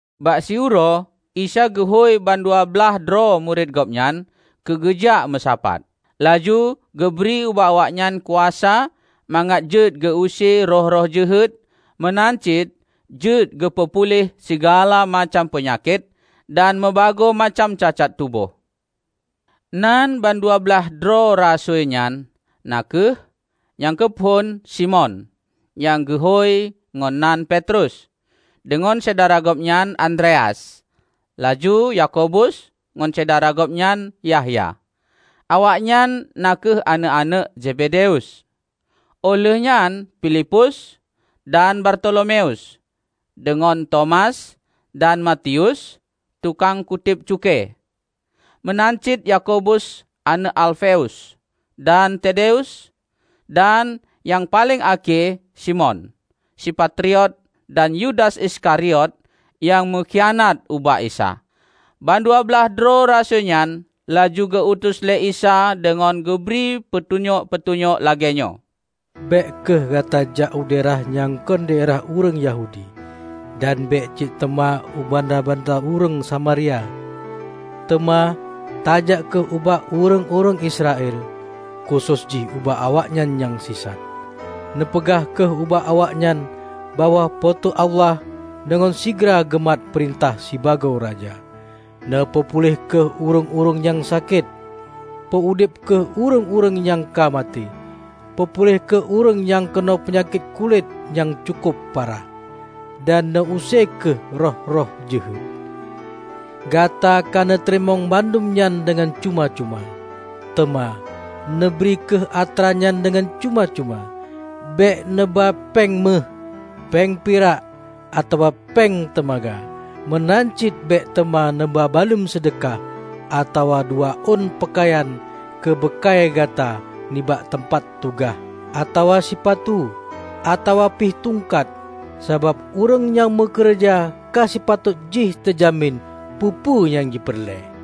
Bak siuroe Isa geuhôi ban dua blaih droe murit Gobnyan keu geujak meusapat. Laju geubri ubak awaknyan kuasa mangat jeuet geu-use roh-roh jeuhet meunan cit jeuet geupeu puléh sigala macam peunyakét dan meubagoe macam cacat tuboh. Nan bandua blaih droe rasui nyan na kheueh: nyang keu phon, Simon (Nyang geuhôi ngon nan Petrus) deungon syedara gobnyan Andreas, laju Yakobus ngon syedara gobnyan Yahya, awaknyan na kheueh aneuëk-aneuëk Zebedeus. Óh lheueh nyan Pilipus dan Bartolomeus, deungon Tomas, dan Matius, tukang kutéb cukée meunan cit Yakobus aneuëk Alfeus, dan Tadeus; dan nyang paleng akhé Simon, si patriot dan Yudas Iskariot nyang meukhianat ubak Isa. Ban dua blaih droe rasui nyan laju geu-utus lé Isa deungon geubri peutunyok-peutunyok lagée nyoe, "Bék kheueh gata jak u daerah nyang kon daerah ureuëng Yahudi. Dan bék cit teuma u banda-banda ureuëng Samaria. Teuma tajak kheueh ubak ureuëng-ureuëng Israel, khusos jih ubak awaknyan nyang sisat. Neupeugah kheueh ubak awaknyan bahwa Po teu Allah deungon sigra geumat peurintah sibagoe Raja. Neupeupuléh kheueh ureuëng-ureuëng nyang sakét; peu-udeb kheueh ureuëng nyang ka maté; peupuléh kheueh ureuëng nyang keunong peunyakét kulét nyang cukob parah, dan neu-use kheueh roh-roh jeuhet. Gata ka neuteurimong bandum nyan deungon cuma-cuma. Teuma, neubri kheueh atra nyan deungon cuma-cuma. Bék neuba péng méuh, péng pirak atawa péng teumaga. Meunan cit bék teuma neuba baluem seudeukah, atawa dua ôn peukayan keu beukai gata nibak teumpat tugaih, atawa sipatu, atawa pih tungkat. Sabab ureuëng nyang meukeureuja ka sipatot jih teujamin peue-peue nyang jipeureulée.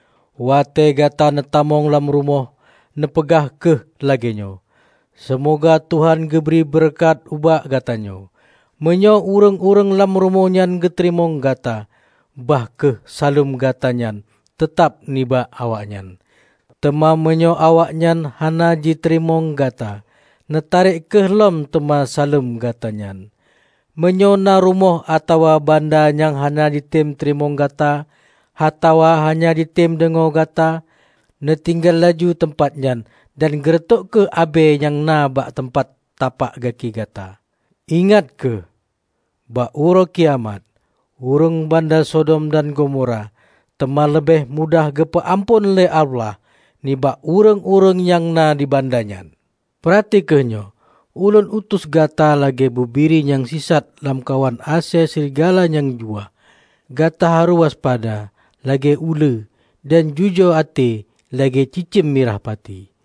Watée gata neutamong lam rumoh, neupeugah kheueh lagée nyoe, "Seumoga Tuhan geubri beureukat ubak gatanyoe." Meunyoe ureuëng-ureuëng lam rumoh nyan geuteurimong gata, bah kheueh saleuem gata nyan teutab nibak awaknyan. Teuma meunyoe awaknyan hana jiteurimong gata, neutarek kheueh lom teuma saleuem gata nyan. Meunyoe na rumoh atawa banda nyang hana jitem teurimong gata atawa hana jitem deungoe gata, neutinggai laju teumpat nyan dan geureutôk kheueh abée nyang na bak tapak gaki gata. Ingat kheueh! Bak Uroe Kiamat, ureuëng banda Sodom dan Gomora teuma leubeh mudah geupeu-amphon lé Allah, nibak ureuëng-ureuëng nyang na di banda nyan!" "Peurati kheueh nyoe: Ulôn utus gata lagée bubiri nyang sisat lamkawan asée srigala nyang juwah. Gata harôh waspada lagée uleue dan jujoe até lagée cicém mirah pati.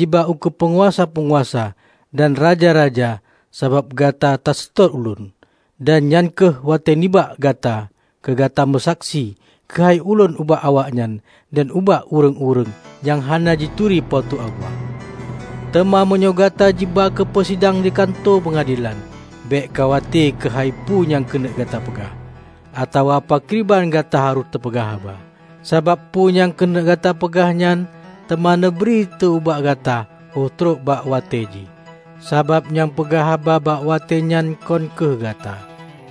Gata teuma jiba ukeue peunguasa-peunguasa dan raja-raja sabab gata taseutôt Ulôn. Dan nyan kheueh watée nibak gata keu gata meusaksi keuhai ulôn ubak awaknyan dan ubak ureuëng-ureuëng nyang hana jituri Po teu Allah. Teuma meunyoe gata jiba keu jipeusidang di kantô peungadelan, bék khawate keuhai peue nyang keuneuk gata peugah, atawa pakriban gata harôh tapeugah haba. Sabab peue nyang keuneuk gata peugah nyan, teuma neubri tée ubak gata óh trok bak watée jih. Sabab nyang peugah haba bak watée nyan kon kheueh gata,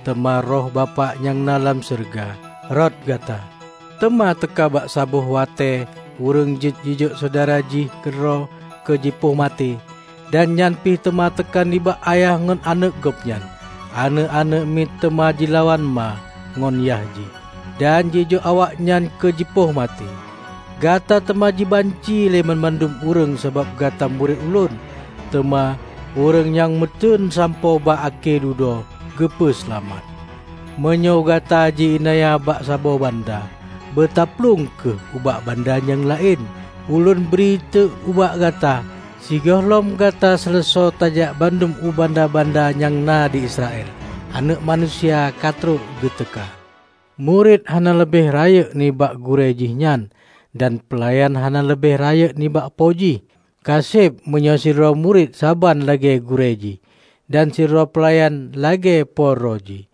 teuma Roh Bapak nyang na dalam syeuruga, rot gata. Teuma teuka bak saboh watée ureuëng jeuet jijok syedara jih keudroe keu jipoh maté. Dan nyan pih teuma teuka nibak ayah ngon aneuëk gobnyan. Aneuëk-aneuëk miet teuma jilawan ma ngon yah jih, dan jijok awaknyan keu jipoh maté. Gata teuma jibanci lé bandum ureuëng sabab gata murit Ulôn. Teuma ureuëng nyang meuteuen sampoe bak akhé dudoe geupeu seulamat. Meunyoe gata ji-iénanya bak saboh banda, beutaplueng kheueh ubak banda nyang laén. Ulôn bri tée ubak gata: Sigohlom gata seuleusoe tajak bandum u banda-banda nyang na di Israel, Aneuëk Manusia ka trok geuteuka. Murit hana leubeh rayeuk nibak gurée jihnyan, dan peulayan hana leubeh rayeuk nibak po jih. Ka seb meunyoe sidroe murit saban lagée gurée jihnyan, dan sidroe peulayan lagée po droe jih.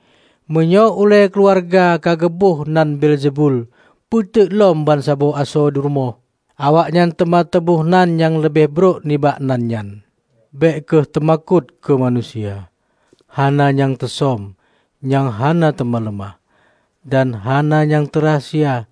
Meunyoe ulée keuluwarga ka geuboh nan Beelzebul, peuteuk lom bansaboh asoe rumoh. Awaknyan teuma teuboh nan nyang leubeh brok nibak nan nyan!" "Bék kheueh teumakot keu manusia. Hana nyang teusöm, nyang hana teuma leumah, dan hana nyang teurahsia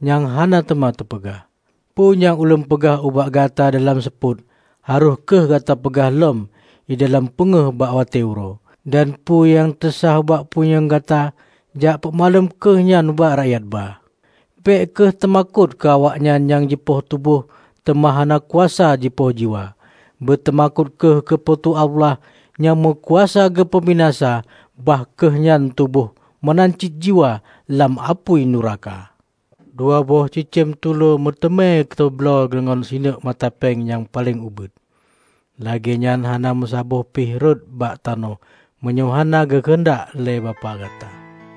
nyang hana teuma teupeugah. Peue nyang Ulôn peugah ubak gata dalam seupôt harôh kheueh gata peugah lom di dalam peungéh bak watée uroe. Dan peue nyang teusháh bak punyueng gata, jak peumaklum kheueh nyan ubak rakyat ba! Bék kheueh teumakot keu awaknyan nyang jipoh tuboh, teuma hana kuasa jipoh jiwa. Beuteumakot kheueh keu Po teu Allah nyang meukuasa geupeubinasa bah kheueh nyan tuboh meunan cit jiwa lam apui nuraka. Dua boh cicém tulôe meuteumé teubloe deungon sineuk mata péng nyang paleng ubit. Lagée nyan hana meusaboh pih rhot bak tanoh meunyoe hana geukeuheundak lé Bapak gata.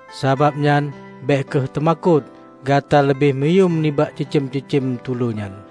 Sabab nyan, bék kheueh teumakot! Gata leubeh meuyuem nibak cicém-cicém tulô nyan!"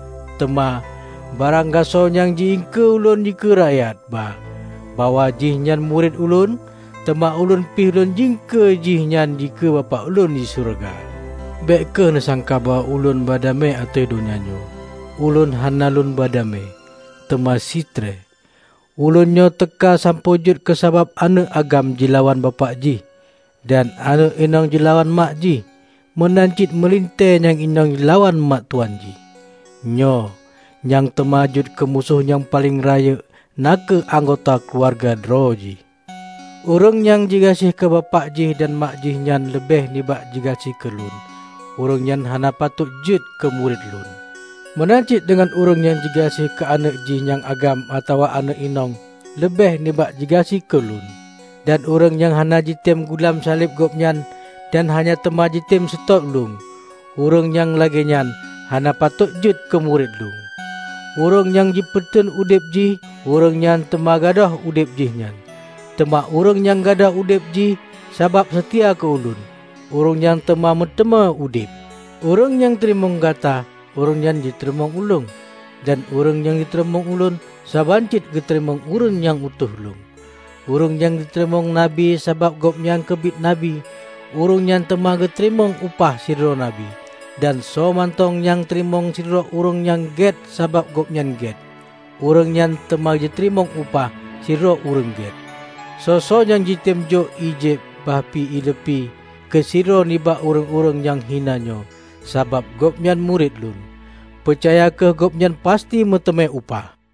Teuma, barang gasoe nyang ji iengkeue Ulôn dikeue rakyat ba bahwa jihnyan murit Ulôn, teuma Ulôn pih Lôn iengkeue jih nyan dikeue Bapak Ulôn di syeuruga." "Bék kheueh neusangka bahwa Ulôn ba damé ateueh donya nyoe. Ulôn hana Lôn ba damé, teuma sitree. Ulôn nyoe teuka sampoe jeuet keusabab aneuëk agam jilawan bapak jih, dan aneuëk inong jilawan mak jih, meunan cit meulintée nyang inong jilawan mak tuwan jih. Nyoe, nyang teuma jeuet keumusoh nyang paleng rayeuk na kheueh anggota keuluwarga droe jih. Ureuëng nyang jigaséh keu bapak jih dan mak jihnyan leubeh nibak jigaséh keu Lôn, ureuëng nyan hana patôt jeuet keu murit Lôn. Meunan cit deungon ureuëng nyang jigaséh keu aneuëk jih nyang agam atawa aneuëk inong leubeh nibak jigaséh keu Lôn. Dan ureuëng nyang hana jitem gulam saleb gobnyan dan hana teuma jitem seutôt Ulôn, ureuëng nyang lagée nyan hana patot jeuet keu murit Lôn. Ureuëng nyang jipeuteun udeb jih, ureuëng nyan teuma gadôh udeb jihnyan, teuma ureuëng nyang gadôh udeb jih sabab seutia keu Ulôn, ureuëng nyan teuma meuteumé udeb." "Ureuëng nyang teurimong gata, ureuëng nyan jiteurimong Ulôn. Dan ureuëng nyang teurimong Ulôn, saban cit geuteurimong ureuëng nyang utus Ulôn. Ureuëng nyang teurimong Nabi sabab gobnyan keubiet Nabi, ureuëng nyan teuma geuteurimong upah sidroe Nabi. Dan soe mantong nyang teurimong sidroe ureuëng nyang gét sabab gobnyan gét, ureuëng nyan teuma jiteurimong upah sidroe ureuëng gét. Soe-soe nyang jitem jok ié jieb, bahpih ié leupie keu sidroe nibak ureuëng-ureuëng nyang hina nyoe, sabab gobnyan murit Lôn, peucaya kheueh gobnyan pasti meuteumé upah!"